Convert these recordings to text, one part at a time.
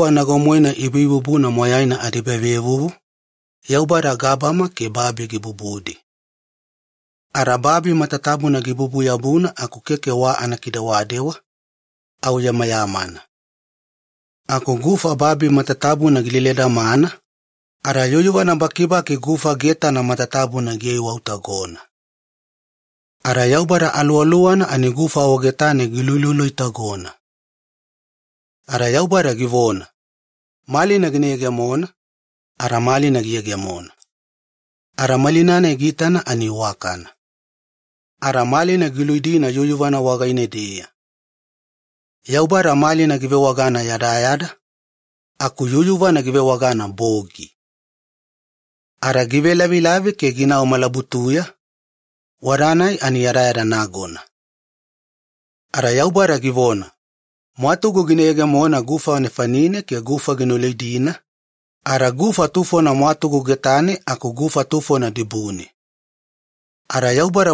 Nago-moena ibuibubuna moyaina adiebavevuvu, Yaubada gabama ke babi gikiveyegemonidi ke gibubudi. Ada babi matatabuna gibubu-yabuna aku keke wa anakidewadewa, au yamayamana. Aku gufa babi matatabuna gileledamana ada yuyuvana bakibaki gufa getana matatabuna gikiwafina. Ada kaduwe Yaubada Aluwaluwana giluluilotagona. Ada Yaubada givona, “Malina gina yegemona.” Ada malina giyegemona. Ada malina-nai giitana ani iwakana, ada malina ke yuyuvana giluididi. Yaubada malina givewagana ‘yadayada’ ke yuyuvana givewagana ‘bogi’. Lavilavi gielai ada ginau malabutuya, tainei bademowa yadayada nagona. Ada yadayada anavelu wagaine Yaubada givona, “Mwatugu gina yegemona gufa nefanine ke gufa gina luidina ada gufa tufona mwatugu getane ke gufa tufona dibune.” Ada giyegemona anafaiweya givona mamauwe.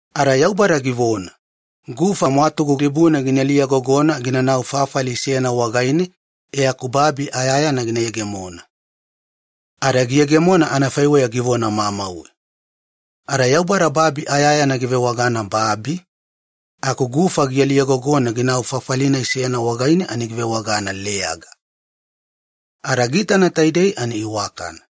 Ada givona, “Gufa gabama dibune ina liyagogona inanau fafali seyana wagaine e aku babi ayayana gina yegemona.” Ada giyegemona anafaiweya givona mamauwe. Ada Yaubada babi ayayana givewagana ‘babi’, aku gufa giliyagogona ginau fafali-nai seyana wagaine ani givewagana ‘leyaga’. Ada Yaubada giitana taidei ani iwakana.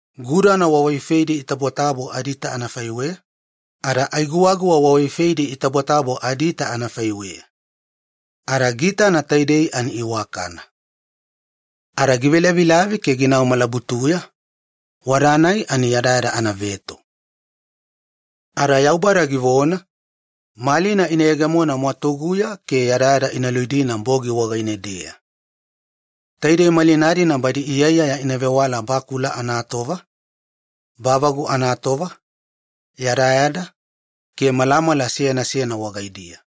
Gudana wawaifeidi itabotabo adiita anafaiweya, ada ai guwaguwa wawaifeidi itabotabo adiita anafaiweya. Yaubada giitana matatabuna ani iwakana. Lavilavi gielai ada ginau malabutuya, tainei bademowa yadayada anaveto. Yadayada anavelaufuli wagaine kaduwe givona, “Malina ina yegemona gabameya ke malina-dina ina luididi yadayada ke bogi. Taidei malina-dina badi iyaiyaya ina vewala bakula anatova, bavagu anatova, yadayada, ke malamala seyana seyana wagaidiya.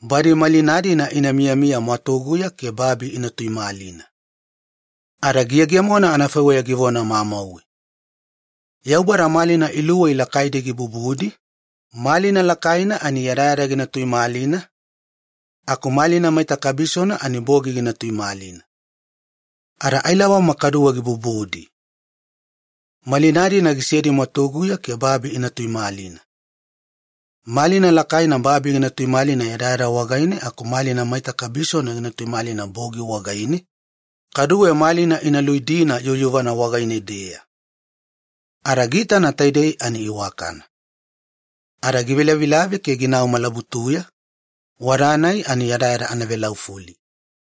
Badi malina-dina ina miyamiya gabameya ke babi ina tuimalina.” Ada giyegemona anafaiweya givona mamauwe. Yaubada malina luwei lakaidi gibubudi, malina lakaina banae yadayada gina tuimalina ke malina maita kabisona banae bogi gina tuimalina. Kaduwe ailabama gibubudi. Malina-dina gisedi gabameya ke babi ina tuimalina. Malina lakaina babi gina veimeya yadayada wagaine, ke malina maita kabisona gina tuimalina bogi wagaine, ada malina ke yuyuvana ina luididi. Ada giitana ani iwakana. Lavilavi gielai ada ginau malabutuya, tainei bademowa yadayada anavelaufuli.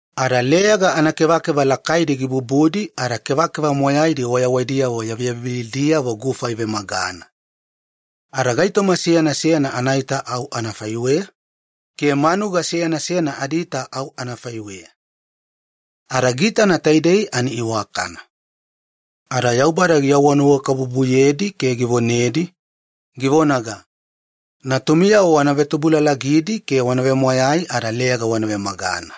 Ada leyaga anakevakeva lakaidi gibubudi ada kevakeva moyaidi wayawaidiyavo yaviyavivilidiyavo gufa ivemagana. Ada gaitoma seyana seyana anaita au anafaiweya, ke manuga seyana seyana adiita au anafaiweya. Ada giitana taidei ani iwakana. Ada Yaubada givonanuwakabubuyedi, givona, “Natumiyavo wana vetubulalagidi ada yoo gina veinala, leyaga wana vemagana.”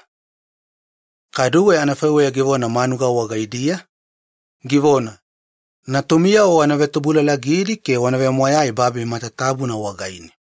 Kaduwe anafaiweya givona manuga wagaidiya, “Natumiyavo wana vetubulalagidi babi matatabuna wagaine.”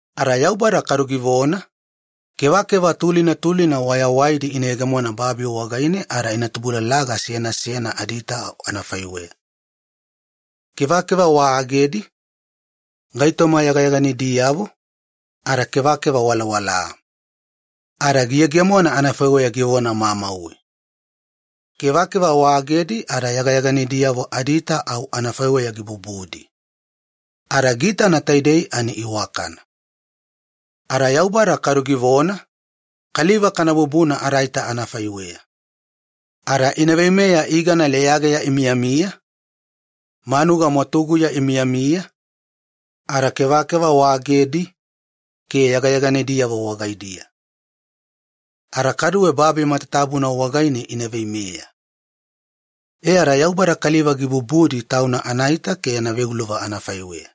Yadayada anavesikisi wagaine Yaubada givona, “Kevakeva tulina tulina wayawaidi ina yegemona ke babi ina vemagana. Ada ina tubulalaga seyana seyana adiita au anafaiweya, kevakeva melamelala, kevakeva geyageyalilidi, ada kevakeva walawala.” Ada giyegemona anafaiweya givona mamauwe. Kevakeva waagedi ada yagayaganidiyavo adiita au anafaiweya gibubudi. Ada giitana taidei ani iwakana. Ada Yaubada givona, “Kaliva kana bubuna adaita anafaiweya ke badi ina veimeya kevakeva leyageya imiyamiya, kevakeva waofadi, ada kevakeva waagedi, ke yagayaganidiyavo wagaidiya. Ada kaduwe babi matatabuna wagaine ina veimeya.” Taidei anafaiweya kaliva gibubudi Tauna anaita ke yana veuluva anafaiweya,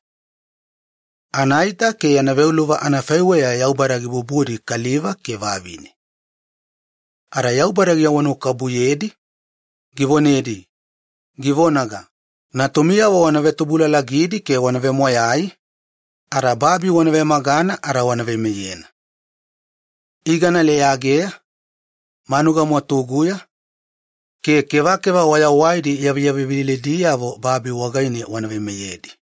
anaita ke yana veuluva anafaiweya Yaubada gibubudi kaliva ke vavine. Yaubada givonanuwakabubuyedi, givona, “Natumiyavo wana vetubulalagidi ada yoo ginaveinala. Babi wana vemagana ada wana veimeyena. Kevakeva leyageya, kevakeva waofadi, ke kevakeva wayawaidi yaviyavivilidiyavo babi wagaine wana veimeyedi.”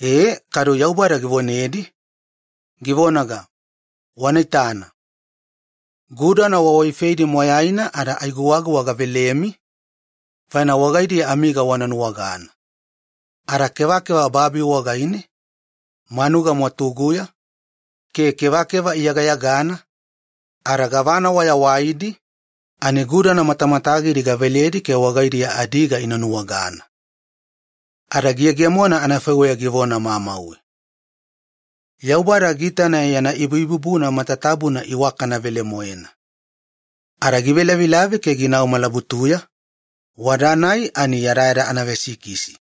Ada Yaubada givona, “Wanaitana. Gudana wawaifeidi matatabuna ada ai guwaguwa gavelemi faina wagaidiya amiga wana nuwagana. Ada kevakeva babi wagaine, manuga mwatuguya ke kevakeva iyagayagana, gavana wayawaidi, ani gudana matamatagidi gaveledi ke wagaidiya adiga ina nuwagana.” Ada giyegemona anafaiweya givona mamauwe. Yaubada giitana yana ibubuna matatabuna iwakana velemoena. Lavilavi gielai ada ginau malabutuya, tainei bademowa yadayada anavesikisi.